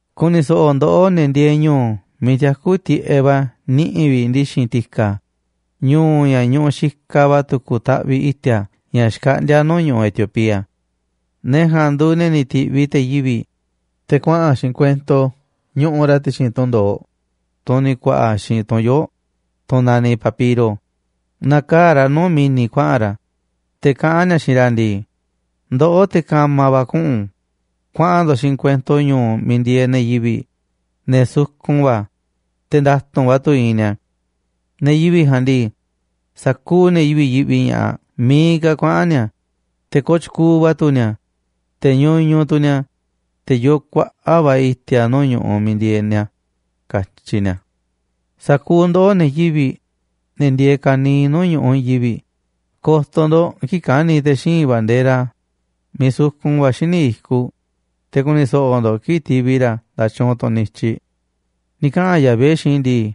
Ku̱ni̱ so̱ꞌo̱ ndoꞌó, ne̱ ndieeꞌ ñu̱u̱ miiꞌ tiakú tiꞌeꞌ va̱ niꞌi̱ vi̱ꞌ ndi̱xi̱n ti̱ka̱, ñu̱u̱ ña̱ ñuꞌuꞌ xikaꞌ va̱ tu̱ku̱ taꞌviꞌ i̱ti̱a̱ ña̱ xkaꞌndíá nuu̱ꞌ ñu̱ꞌuꞌ Etiopía. Ne̱ ja̱a̱nꞌ nduuꞌ ne̱ tiꞌviꞌ te̱ yivi̱ꞌ, te̱ kuaꞌa̱n xiinꞌ kuento ñuꞌuꞌ ra̱ ti̱xi̱n tunꞌ ndo̱oꞌ, tunꞌ ni̱ ku̱a̱ꞌa̱ xiinꞌ tu̱n yoo̱ꞌ, tunꞌ naniꞌ papiro, nakaa̱ꞌ ra̱ nuu̱ꞌ mi̱ni̱ kuaꞌa̱n ra̱, te̱ kaꞌán ni̱a̱ xiinꞌ ra̱ ndii: “Ndoꞌó, te̱ ka̱ma̱ va̱ kuꞌu̱n, kuaꞌa̱n ndo̱ꞌ xiinꞌ kuento ñu̱u̱ miiꞌ ndieeꞌ ne̱ yivi̱ꞌ, ne̱ sukun va̱, te̱ nda̱tu̱nꞌ va̱ tu̱ iinꞌ ni̱a̱. Ne̱ yivi̱ꞌ ja̱a̱nꞌ ndii, sa̱kuuꞌ ne̱ yivi̱ꞌ yiꞌvi ña̱ꞌaꞌ miiꞌ ka̱ kuaꞌa̱n ni̱a̱, te̱ kooꞌ tyukuuꞌ va̱ tu̱ ni̱a̱, te̱ ñuñuꞌ tu̱ ni̱a̱, te̱ yoo kuaꞌa̱ꞌ va̱ i̱ti̱a̱ nuu̱ꞌ ñu̱ꞌuꞌ miiꞌ ndieeꞌ ni̱a̱”, katyi ni̱a̱. Sa̱kuuꞌ ndoꞌó, ne̱ yivi̱ꞌ, ne̱ ndieeꞌ ka̱niiꞌ nuu̱ꞌ ñu̱ꞌuꞌ i̱i̱n yivi̱ꞌ, ko̱to̱ ndo̱ꞌ kii̱ꞌ ka̱ni̱ te̱ xíinꞌ bandera miiꞌ sukun va̱ xíniꞌ i̱kuꞌ, te̱ ku̱ni̱ so̱ꞌo̱ ndo̱ꞌ kii̱ꞌ ti̱vi̱ ra̱ nda̱tyuunꞌ tunꞌ niꞌiꞌ i̱tyiꞌ. Ni̱ kaꞌa̱n Yahvé xiinꞌ i̱ ndii: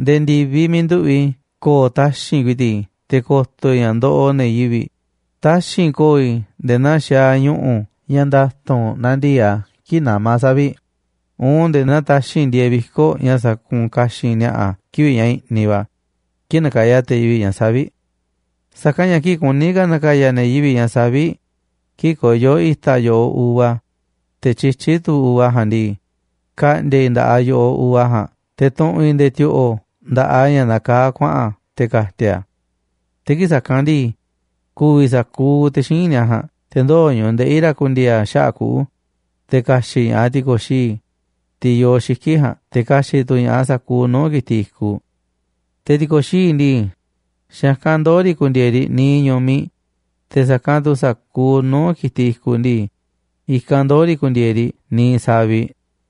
“Nde̱e̱ ndi̱viꞌ miiꞌ nduꞌu̱ꞌ i̱ ko̱o̱ taxi̱nꞌ ku̱i̱ti̱ꞌ i̱ te̱ ko̱to̱ i̱ ña̱ ndoꞌoꞌ ne̱ yivi̱ꞌ, taxi̱nꞌ ko̱o̱ i̱ nde̱e̱ naa xaaꞌ ñu̱ꞌu̱ ña̱ nda̱tu̱nꞌ nandii̱ꞌ a̱ kii̱ꞌ namá savi̱ꞌ, uun nde̱e̱ naa taxi̱nꞌ ndieeꞌ viko̱ꞌ ña̱ sakuunꞌ ka̱xi̱n ni̱a̱ꞌa̱ kivi̱ꞌ ña̱ i̱ꞌniꞌ va̱ kii̱ꞌ nakaya te̱ yivi̱ꞌ ña̱ savi̱ꞌ”, ni̱ katyi̱ a̱. Sa̱kanꞌ ña̱ kii̱ꞌ kuní ka̱ na̱ka̱ya̱ ne̱ yivi̱ꞌ ña̱ savi̱ꞌ, kii̱ꞌ koyó i̱ta̱ yo̱ꞌoꞌ uva, te̱ tyityí tu̱ uva ja̱a̱nꞌ ndii, ka̱ꞌndi̱a̱ i̱ nda̱ꞌaꞌ yo̱ꞌoꞌ uva ja̱a̱nꞌ te̱ tu̱ꞌu̱n i̱ nde̱e̱ ti̱o̱ꞌo̱ nda̱ꞌaꞌ a̱ ña̱ nakaá kuaꞌa̱n te̱ ka̱ti̱a̱ i̱ a̱. Te̱ kii̱ꞌ sa̱kanꞌ ndii, ku̱vi̱ sa̱kuuꞌ te̱ xíinꞌ ni̱a̱ ja̱a̱nꞌ, te̱ ndoo̱ ñu̱ꞌuꞌ ndeꞌi̱ ra̱ ku̱ndi̱e̱e̱ a̱ xaꞌa̱ꞌ kuꞌu̱, te̱ ka̱xi̱ꞌ ña̱ꞌaꞌ ti̱ko̱xií, tiꞌ yoo xiki̱ꞌ ja̱a̱nꞌ, te̱ ka̱xi̱ꞌ tu̱ ña̱ꞌaꞌ sa̱kuuꞌ nuu̱ꞌ ki̱tiꞌ i̱kuꞌ. Te̱ ti̱ko̱xií ndii, xa̱ i̱kanꞌ ndoo̱ riꞌ ku̱ndi̱e̱e̱ riꞌ niiꞌ ñu̱miꞌ, te̱ sa̱kanꞌ tu̱ sa̱kuuꞌ nuu̱ꞌ ki̱tiꞌ i̱kuꞌ ndii, i̱kanꞌ ndoo̱ riꞌ ku̱ndi̱e̱e̱ riꞌ niiꞌ saviꞌ.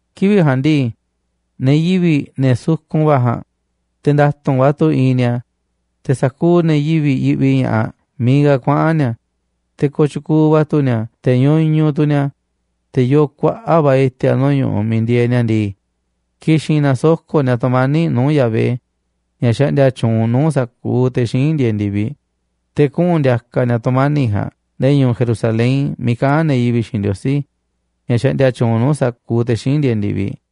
Kivi̱ꞌ ja̱a̱nꞌ ndii, ne̱ yivi̱ꞌ, ne̱ sukun va̱ ja̱a̱nꞌ, te̱ nda̱tu̱nꞌ va̱ tu̱ iinꞌ ni̱a̱, te̱ sa̱kuuꞌ ne̱ yivi̱ꞌ yiꞌvi ña̱ꞌaꞌ miiꞌ ka̱ kuaꞌa̱n ni̱a̱, te̱ kooꞌ tyukuuꞌ va̱ tu̱ ni̱a̱, te̱ ñuñuꞌ tu̱ ni̱a̱. Te̱ yoo kuaꞌa̱ꞌ va̱ i̱ti̱a̱ nuu̱ꞌ ñu̱ꞌuꞌ miiꞌ ndieeꞌ ni̱a̱ ndii, ki̱xi̱n na̱soko̱ꞌ ni̱a̱ tu̱mani̱ꞌ nuu̱ꞌ Yahvé, ña̱ xaꞌndia tyuunꞌ nuu̱ꞌ sa̱kuuꞌ te̱ xíinꞌ ndieeꞌ ndi̱viꞌ. Te̱ kuꞌu̱n ndi̱a̱ka̱ ni̱a̱ tu̱mani̱ꞌ ja̱a̱nꞌ nde̱e̱ ñu̱u̱ Jerusalén miiꞌ kaꞌán ne̱ yivi̱ꞌ xiinꞌ Ndiosí, ña̱ xaꞌndia tyuunꞌ nuu̱ꞌ sa̱kuuꞌ te̱ xíinꞌ ndieeꞌ ndi̱viꞌ.